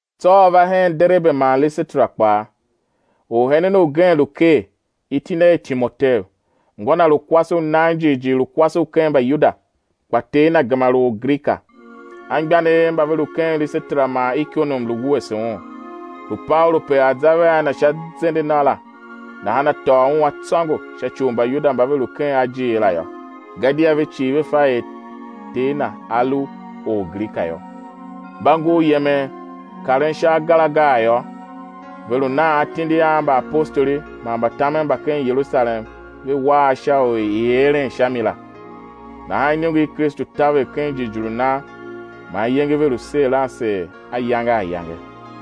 Tsô a va hen Derebe man Lisetera kpaa. Orhenen ugen lu ker, iti na er Timoteu, ngô na lu kwase u nan jighjigh lu kwase u ken Mbayuda, kpa ter na gema lu Orgrika; anmgbianev mba ve lu ken Lisetera man Ikonium lu wuese un. Lu Paulu pe a̱ za vea na sha zende na la, nahan a tôô un a tsôngo sha ci u Mbayuda mba ve lu ken ajiir la yô; gadia ve cii ve fa er ter na a lu Orgrika yô. Mba ngur yemen karen sha agar agar yô, ve lu nan atindi a mbaapostoli man mbatamen mba ken Yerusalem ve wa a sha u i̱ eren sha mi la. Nahan iniongo i Kristu taver ken jighjigh u nan, man iyenge ve lu seer a seer ayange ayange.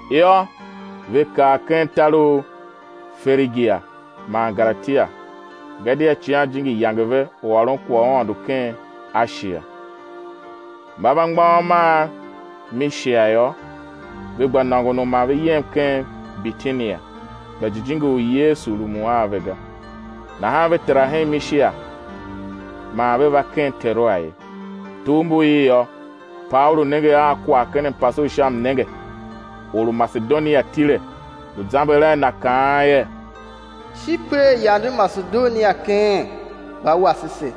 Yô, ve kar ken tar u Ferigia man Galatia, gadia Icighan Jijingi yange ve u ôron kwagh u Aôndo ken Ashia. Mba va mgbôghom a Mishia yô, ve gba nôngon u ma ve yem ken Bitinia, kpa Jijingi u Yesu rumun a ve ga. Nahan ve tera ken Mishia man ve va ken Teroa ye. Tugh mbu il yô, Paulu nenge a kwagh ken mpase u sha mnenge, or u Masedonia tile, lu zamber a na, kaan er Shi per yande Masedonia keen, va wase se.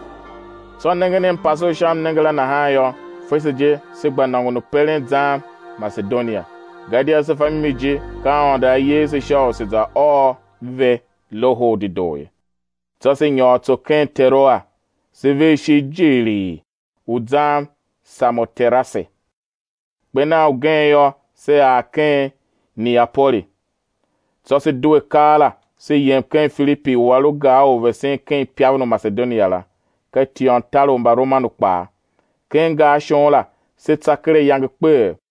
Tsô nengen mpase u sha mnenge la nahan yô, fese je se gba nôngon u peren zan Masedonia, gadia se fa mimi je, ka Aôndo A yer se sha u se̱ za ôr ve Loho u Dedoo ye. Tsô se nyôr tso ken Teroa, se ver ishigh jighilii u zan Samoterase; kper nan ugen yô, se ar ken Neapoli. Tsô se due keela se yem ken Filipi u a lu gar u vesen ken ipaven u Masedonia la, ka tiôntar u Mbaromanu kpaa. Ken gar shon la se tsa ker ayange kpeghee.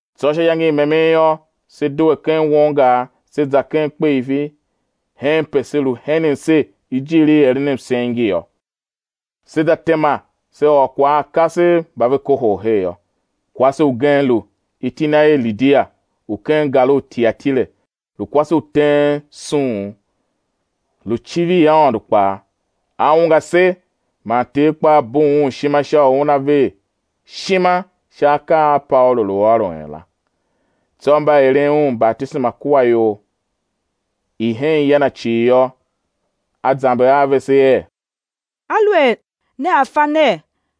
Tsô sha iyange i memen yô, se due ken won gar, se za ken kpeifi henpe se lu henen ser ijiir i eren msen ngi yô; se za tema, se ôr kwagh a kasev mba ve kohol her yô. Kwase ugen lu, iti na er Lidia u ken gar u Tiatire, lu kwase u teen suun, lu civir Aôndo kpaa; a ungwa se, man Ter kpaa bugh un ishima sha u una ver ishima sha akaa a Paulu lu ôron la. Tsô mba eren un batisema kua ior i hen ya na cii yô, a zamber a vese er: Aluer nea fa ner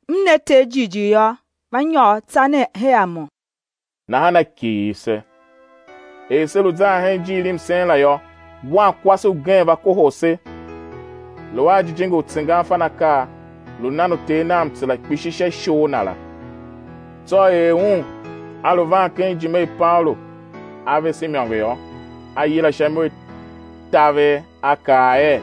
m na Ter jighjigh yô, va nyôr tsa nen her a mo. Nahan a kighir se. Er se lu zan hen ijiir i msen la yô, wankwase ugen va kohol se, lu a jijingi u tsengan fan akaa, lu nan uter nav mtsera kpishi sha ishor na la. Tsô er un a lu van ken ijime i Paulu a vese imôngo yô, a yila sha imo i taver, a kaa er: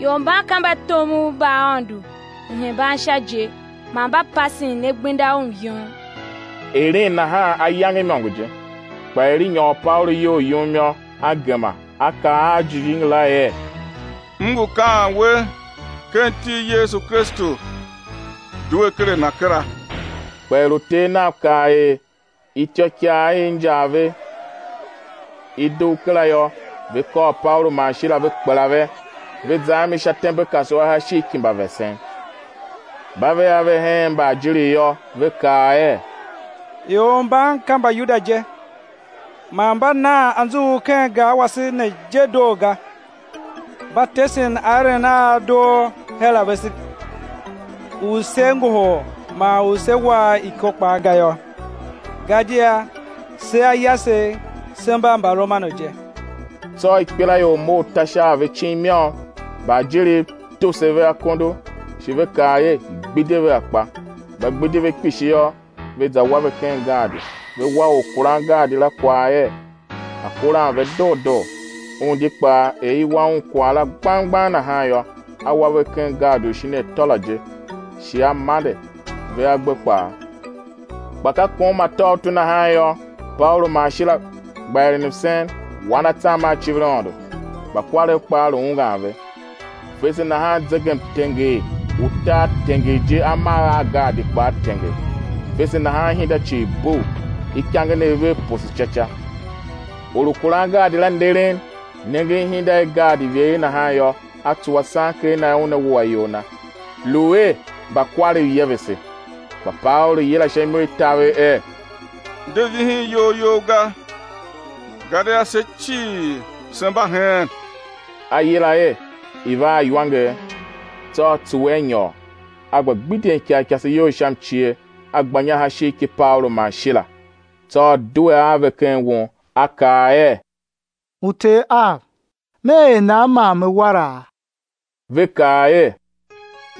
Ior mban ka mbatomov mba Aôndo Uhembansha je, man mba pasen ne gbenda u myom. Eren nahan ayange imôngo je. Kpa er i nyôr Paulu iyol yum yô, a gema, a kaa a jijingi la er: M ngu kaan we ken iti i Yesu Kristu, due ker a na kera. Kpa er uter nav kav er ityôikaa i injar ve i dugh kera yô, ve kôr Paulu man Shila ve kpela ve, ve za a mi sha tembekasua sha ishigh ki mbavesen. Mba ve a ve hen mbaajiriv yô, ve kaa er: Ior mban ka Mbayuda je, man mba nan anzughul ken gar wase ne je doo ga; mba tesen aeren a a doo her a vese u sé ngohol man u sé wa a iko kpaa ga yô; gadia se a yasegh se mba Mbaromanu je. Tsô ikpelaior mough ta sha a ve icin i môm; mbaajiriv tuse ve akondo, shi ve kaa er, i̱ gbidye ve akpa. Mba gbidi ve kpishi yô, ve za wa ve ken gaadi, ve wa orkurangaadi la kwagh er, a̱ kuran ve doo doo. Un di kpaa, er i wa un kwagh la gbang gbang nahan yô, a wa ve ken gaadi u shin atô la je, shi a mande ve agbe kpaa. Kpa ka kom atôutu nahan yô, Paulu man Shila gba eren msen, wan atsam a civir Aôndo; mbakwarev kpaa lu ungwan ve. Fese nahan zegemtenger u tar tenger je amagh a gaadi kpaa tenger; fese nahan ihinda cii bugh, ikangenev vev poso ca ca. Or u kuran gaadi la nderen, nengen ihinda i gaadi ivegher nahan yô, a tsuwa sanker na er una wua iyol na, lu er mbakwarev yevese. Kpa Paulu yila sha imo i taver er: De vihin iyol you ga, gadia se cii se mba heen. A yila er i̱ va a iwanger; tsô a tsuwe a nyôr, a gba gbidyen ikarikase iyol sha mcie, a gba inya sha ishigh ki Paulu man Shila. Tsô a due a ve ken won, a kaa er: Uter av, me er nan man me wara? Ve kaa er: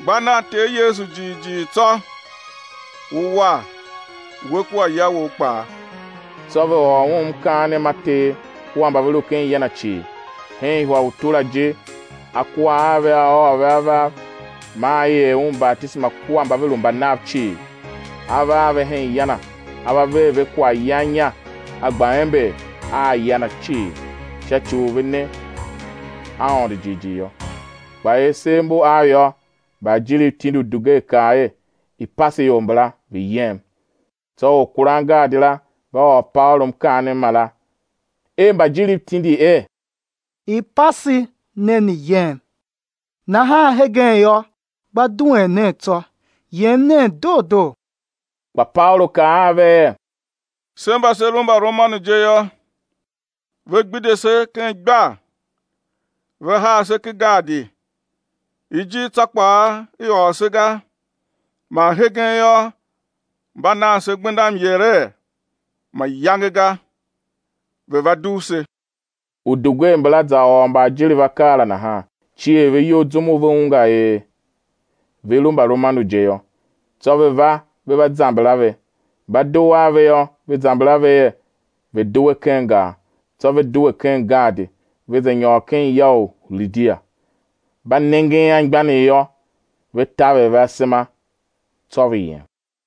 Gba nan Ter Yesu jighjigh tsô ú war, we kua ya wou kpaa. Tsô ve ôr un mkaanem ma Ter kua mba ve lu ken ya na cii. Hen ihwa i utu la je a kua a ve a ôô ve avav maa i er un batisema kua mba ve lu mba nav cii. A va a ve hen ya na, a va ver ve kwaghyan inya, a gba ember a ya na cii, sha ci u ve ne Aôndo jighjigh yô. Kpa er sev mbu av yô, mbaajiriv tindi udugwer kaa er: I̱ pase ior mbala, ve̱ yem. Tsô orkurangaadi la va ôr Paulu mkaanem mara er mbaajiriv tindi er: I̱ pase ne ne̱ yem; nahan hegen yô, gba duen nen tsô, yem nen doo doo. Kpa Paulu kaa a ve er: Se mba se lu Mbaromanu je yô, ve gbidye se ken igbar, ve haa se ken gaadi, ijir tsô kpaa i ôr se ga, man hegen yô, mba nan se gbenda myere? Mayange ga, ve̱ va dugh se. Udugwer mbala za ôr mbaajiriv akaa la, nahan cier ve iyol zum u ve ungwa er ve lu Mbaromanu je yô. Tsô ve va, ve va zamber a ve. Mba dugh ave yô, ve zamber a ve er, ve̱ due ken gar. Tsô ve due ken gaadi, ve za nyôr ken ya u Lidia. Mba nengen anmgbianev yô, ve taver ve asema; tsô ve yem.